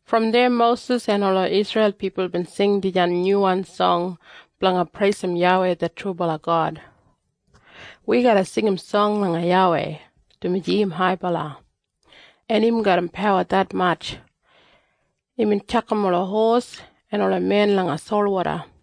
Brom deya Mosis en ola Isreil pipul bin sing dijan nyuwan song blanga preisim YAWEI det trubala God. “Wi garra singim song langa YAWEI, dumaji im haibala, en im garram pawa detmatj. Imbin tjakam ola hos en ola men langa solwoda.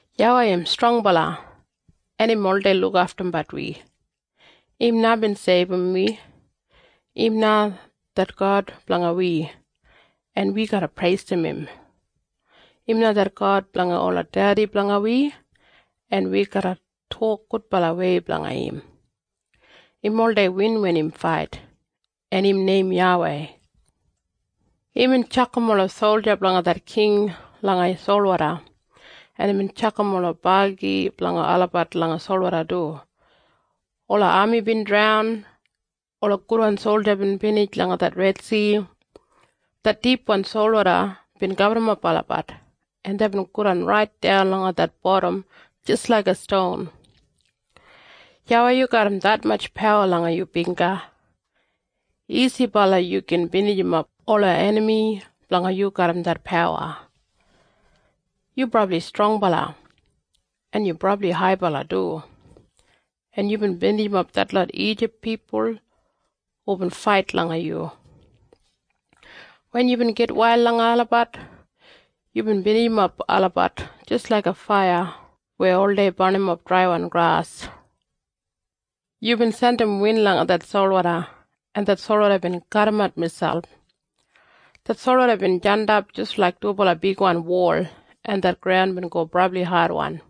YAWEI im strongbala, en im oldei lukaftumbat wi. Im na bin seibum wi. Im na det God blanga wi, en wi garra preisim im. Im na det God blanga ola dedi blanga wi, en wi garra tok gudbalawei blanga im. Im oldei win wen im fait. En im neim YAWEI. Imbin tjakam ola solja blanga det king langa solwoda, en imbin tjakam ola bagi blanga olabat langa solwoda du. Ola ami bin draunt. Ola gudwan solja bin binij langa det Redsi. Det dipwan solwoda bin gaburrumap olabat, en deibin godan raitdan langa det bodam jis laiga ston. YAWEI, yu garram detmatj pawa langa yu bingga. Isibala yu gin binijimap ola enami blanga yu garram det pawa. Yu brabli strongbala, en yu brabli haibala du, en yubin binijimap detlot Ijip pipul hubin fait langa yu. Wen yubin gitwail langa olabat, yubin binijimap olabat jis laiga faiya weya oldei barnimap draiwan gras. Yubin jandim win langa det solwoda, en det solwoda bin kadimat miselp. Det solwoda bin jandap jis laik dubala bigwan wol, en det graun bin go brabli adwan.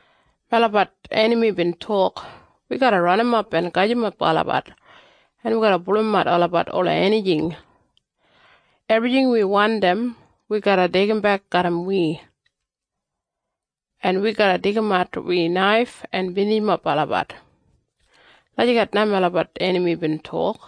Melabat enami bin tok, ‘Wi garra ranimap en gajimap olabat, en wi garra pulumat olabat ola enijing. Ebrijing wi wandim wi garra deigimbek garram wi, en wi garra deigimat wi naif en binijimap olabat.’ Lagijat na melabat enami bin tok.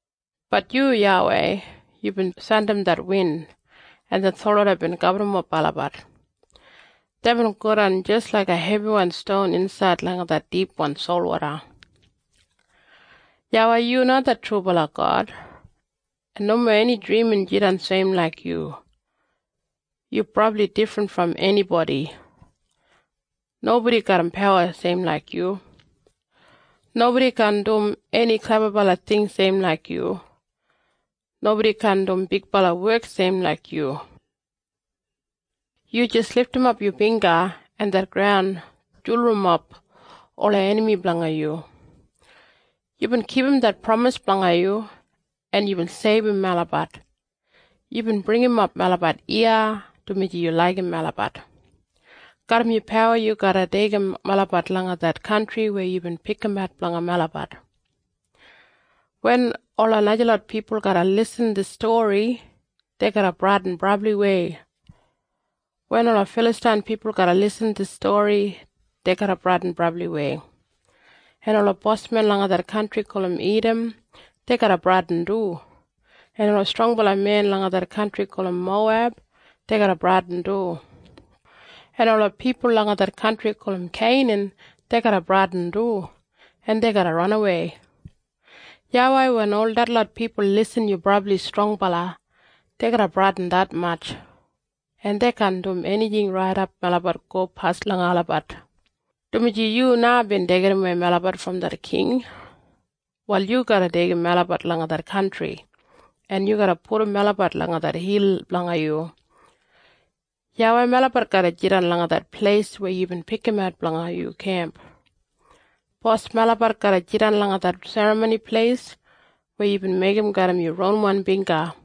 Bat yu, YAWEI, yubin jandim det win, en det solwoda bin gaburrumap olabat. Deibin godan jis laiga hebiwan ston insaid langa det dipwan solwoda. YAWEI, yu na det trubala God, en nomo eni drimin jidan seim laik yu. Yu brabli difrin brom enibodi. Nobodi garram pawa seim laik yu. Nobodi kaan dum eni klebabala ting seim laik yu. Nobodi kaan dum bigbala wek seim laik yu. Yu jis lidimap yu bingga, en det graun julurumap ola enami blanga yu. Yubin kipum det pramis blanga yu, en yubin seibum melabat. Yubin bringimap melabat iya, dumaji yu laigim melabat. Garram yu pawa yu garra deigim melabat langa det kantri weya yubin pikimat blanga melabat. Wen ola najalot pipul garra irrim dis stori, dei garra bradin brabliwei. Wen ola Filastain pipul garra irrim dis stori, dei garra bradin brabliwei. En ola bosmen langa det kantri gulum Idam, dei garra bradin du. En ola strongbala men langa det kantri gulum Moweb, dei garra bradin du. En ola pipul langa det kantri gulum Keinan, dei garra bradin du, en dei garra ranawei. YAWEI, wen ol detlot pipul irrim yu brabli strongbala, dei garra bradin detmatj, en dei kaan dum enijing raidap melabat gopas langa olabat, dumaji yu na bin deigidawei melabat brom det king. Wal yu garra deigim melabat langa det kantri, en yu garra pudum melabat langa det hil blanga yu. YAWEI, melabat garra jidan langa det pleis weya yubin pikimat blanga yu kemp. Bos, melabat garra jidan langa det Serramoni Pleis weya yubin meigim garram yu ronwan bingga.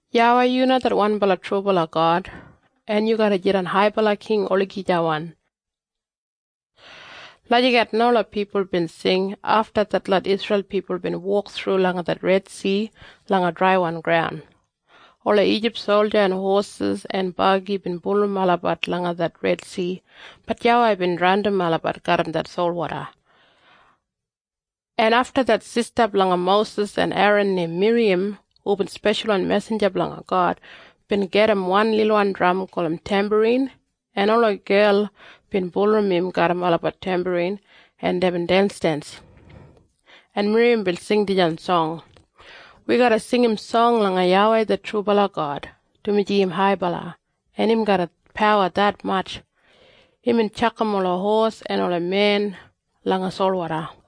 YAWEI, yu na det wanbala trubala God, en yu garra jidan haibala king olagijawan.” Lagijat na ola pipul bin sing, afta detlot Isreil pipul bin wok thru langa det Redsi langa draiwan graun. Ola Ijip solja en hosis en bagi bin bulurrum olabat langa det Redsi, bat YAWEI bin draundim olabat garram det solwoda. En afta det sista blanga Mosis en Eran neim Miriyam hubin speshalwan mesinja blanga God bin gedim wan lilwan dram gulum tembarin, en ola gel bin bulurrum im garram olabat tembarin, en deibin densdens, en Miriyam bin sing dijan song. “Wi garra singim song langa YAWEI det trubala God, dumaji im haibala, en im garram pawa detmatj. Imbin tjakam ola hos en ola men langa solwoda.”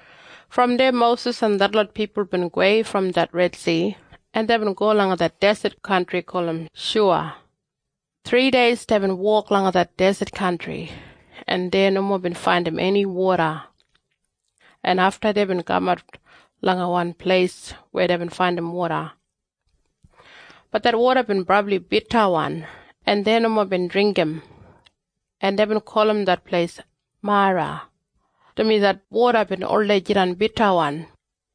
Brom deya Mosis en detlot pipul bin gowei brom det Redsi, en deibin go langa det deset kantri gulum Shuya. Thrideis deibin wok langa det deset kantri, en dei nomo bin faindim eni woda, en afta deibin kamat langa wan pleis weya deibin faindim woda. Bat det woda bin brabli bitawan, en dei nomo bin dringgim, en deibin gulum det pleis Mara, dumaji det woda bin oldei jidan bitawan.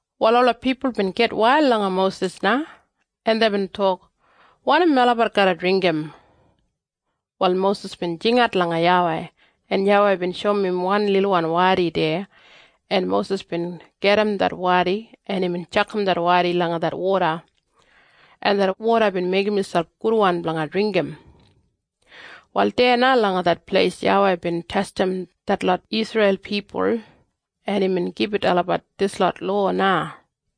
Wal ola pipul bin gitwail langa Mosis na, en deibin tok, “Wanim melabat garra dringgim?” Wal Mosis bin jingat langa YAWEI, en YAWEI bin shoum im wan lilwan wadi deya, en Mosis bin gajim det wadi, en imbin tjakam langa det woda, en det woda bin meigim miselp gudwan blanga dringgim. Wal deya na langa det pleis YAWEI bin testim detlot Isreil pipul, en imbin gibit olabat dislot lowa na.